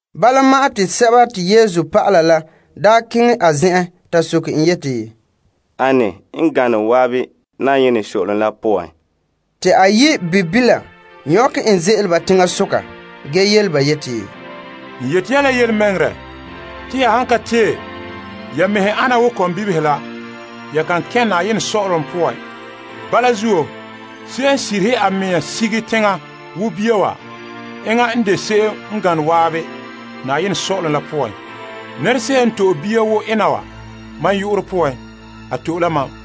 Bala ma'an te Yesu dɔlɔba la daa keŋɛ a zen'en ta soke en yeti, Ane n gane zan'an saazuo sɔ'ɔlom la poan? Te a yi' bibila nyɔkɛ en ze'ele ba teŋasoka ge yele ba yeti, N yeti ya la yelemɛŋɛrɛ te ya han ka tee ya mɛhe ana wo kɔmbibihe la, ya kan kɛn' saazuo sɔ'ɔlom poan. Bala zuo, se'em n sirihe a mea sige teŋa wo bia wa, enŋa n de se'em gane zan'an saazuo sɔ'ɔlom la poan. Nɛra se'em n to'e bia wa wo ena wa mam yu'urɛ poan, a to'e la mam.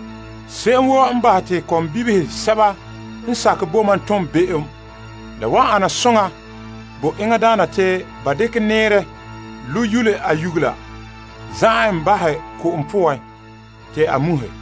Se'em woo n bahɛ te kɔmbibihe sɛba n sakɛ bo mam tom be'em, la wan ana soŋa bo enŋadaana te ba dekɛ nɛɛrɛ lo' yule a nyugela za'ɛ en bahɛ ko'om poan te a muhɛ.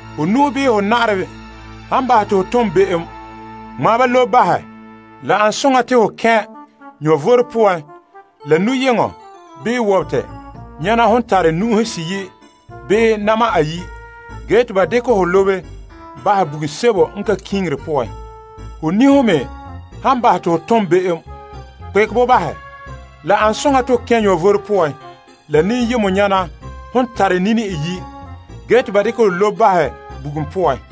Ho nu'o bii ho na'arɛ han bahɛ te ho tom be'em, ŋmaa ba lobe bahɛ. La ane soŋa te ho kɛn' vom poan la nu'yeŋɔ bii wobete yaana hon tare nu'uhe seyi' bii na'ma ayi' ge te ba dekɛ ho lobe bahɛ bugum sebo n ka kiŋire poan. Ho niho me han bahɛ te ho tom be'em, kpekɛ bo bahɛ. La an soŋa te ho kɛn' vom poan la niyemɔ nyana hon tare nini iyi' ge te ba dekɛ ho lobe bahɛ bugum poan.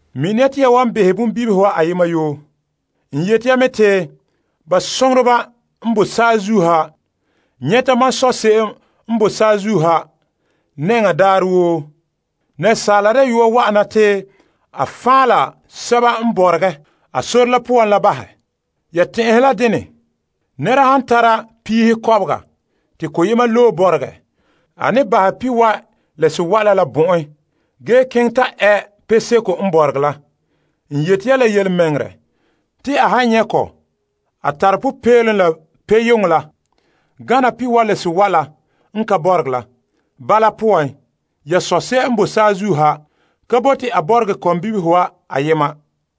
Mini ya te ya wan behɛ bonbibihe wa ayema yoo. N yeti ya me te ba soŋoreba n boe saazuo ha nyɛte mam Sɔ' n boe saazuo ha nɛŋan daarɛ woo. Asaala Dayɔa wa'ana te a fan' la sɛba n bɔregɛ la bahɛ. Ya tɛn'ɛhe la dene? Nɛra han tara piihe kɔbega, te koyema loe bɔregɛ, a ne bahɛ pihiwae' la sewae' la bɔ'ɛn gee keŋɛ ta ɛ peseko n bɔregɛ la. N yeti ya la yelemɛŋɛrɛ te a han nyɛ' kɔ, a tare popeelom la peyeŋɔ la gana pihiwae' la sewae' la n ka bɔregɛ la. Bala poan, ya Sɔ' n boe saazuo ha ka bote a bɔregɛ kɔmbibihe wa ayema.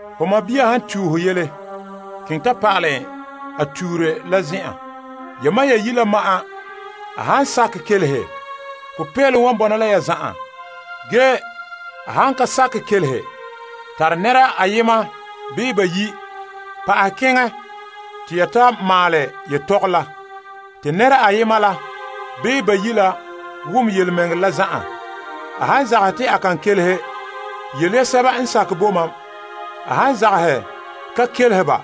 Ho sɔɔn han tue ho yele, keŋɛ ta pa'alɛ en a tuure la zen'an, yamam ya yi' la ma'an. A han kelehe, ho fan' ho sɔɔn la mɛ n bala. Ge a han ka kelehe, tare nɛra ayema bii bayi' pa'ahɛ keŋɛ te ya ta maalɛ yetɔgom la te nɛra ayema la bii bayi' la wom yelemɛŋɛrɛ la zan'an. A han zagahɛ te a kan kelehe, yele ya bo lagaŋɔ. A han zagahɛ ka kelehe ba,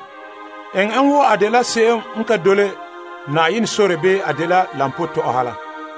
eŋɛ en wo se'em n ka mi Yenɛ bii lampootɔ'ɔha la.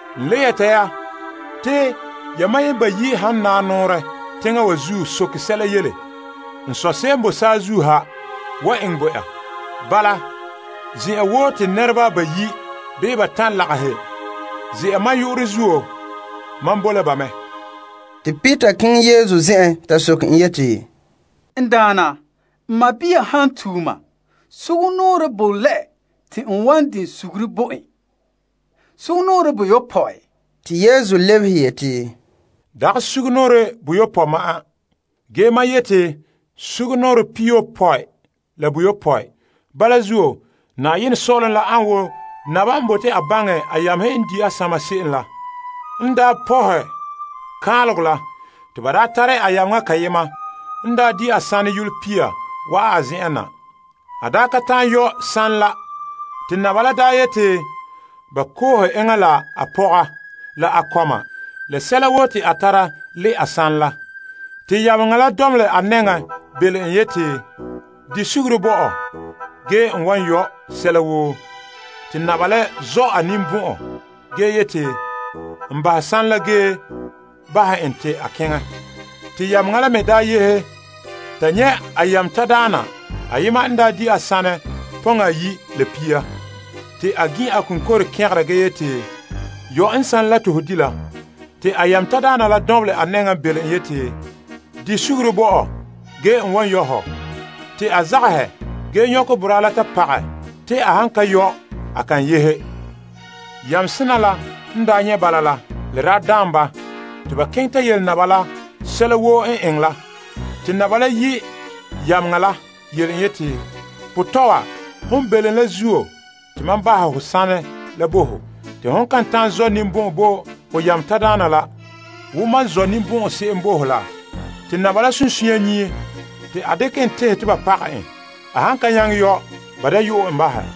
N le yɛta ya te yamam bayi' han naa nɔɔrɛ teŋa wa zuo soke sɛla yele, n Sɔ' n boe saazuo ha wan eŋɛ bo ya. Bala, zen'an woo te nɛreba bayi' bii batan' lagahɛ ze'a mam yu'urɛ zuo, mam boe la ba mɛ. Te Peter keŋɛ Yesu zen'en ta soke en yeti, N Daana, n sɔɔn han tue mam, sugumnɔɔren bo lɛ te n wan di suguru bo en? Sugumnɔɔren boyopɔe? Te Yesu lebehe yeti, Dagɛ sugumnɔɔren boyopɔe ma'an, ge mam yeti sugumnɔɔren pihiyopɔe la boyopɔe. Bala zuo, saazuo sɔ'ɔlom an woo naba n bote a baŋɛ a yamehe n di' a sama se'em la. N daa pɔhɛ kaanlegɔ la, te ba tare a yameŋa kayema n daa di a sanɛ yolɔ tuha wa'an a zen'en na. A ka ta'an yɔ' sanɛ la zuo, a daana la daa yeti ba koohe enŋa la a pɔga la a kɔma la sɛla woo te a tara le' a sanɛ la. Yameŋa la dɔnbelɛ a nɛŋan belom en yeti, Di suguru bo ɔ gee n wan yɔ' sɛla woo. Yameŋa daana la zɔ' a ninbɔn'ɔn ge yeti a bahɛ sanɛ la ge bahɛ en te a keŋɛ. Ge yameŋa la n yehe, ta nyɛ' a yameŋa tadaana ayema n di' a sanɛ yolɔ pia. Te a gin' a koŋkore kɛgera ge yeti, Yɔ' n sanɛ la te ho di' la. Te a yameŋa tadaana la dɔnbelɛ a nɛŋan belom en yeti, Di suguru bo ɔ ge n wan yɔ' hɔ. Ge a zagahɛ ge nyɔkɛ boraa la ta pagɛ te a han ka yɔ', a kan yehe. Yameŋa sena la n daa nyɛ' bala la, la daa daan ba, te ba keŋɛ ta yele naba la sɛla woo n eŋɛ la. Te naba la yi' yameŋa la yele en yeti, Potɔɔ wa, hon belom la zuo te mam bahɛ ho sanɛ la bo ho. Te hon kan ta'an zɔ' ninbɔn'ɔn bo ho yameŋa tadaana la wo mam zɔ' ninbɔn'ɔn bo ho se'em la? Te a daana la sunsunya nyie te a dekɛ en tehɛ te ba pagɛ en. A han ka nyaŋɛ yɔ', ba da yo'ɛ en bahɛ.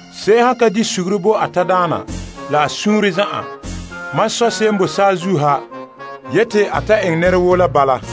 Se'em han ka di suguru bo a tadaana la a suunre zan'an, mam Sɔ' n boe saazuo ha yeti a ta eŋɛ nɛra woo la bala.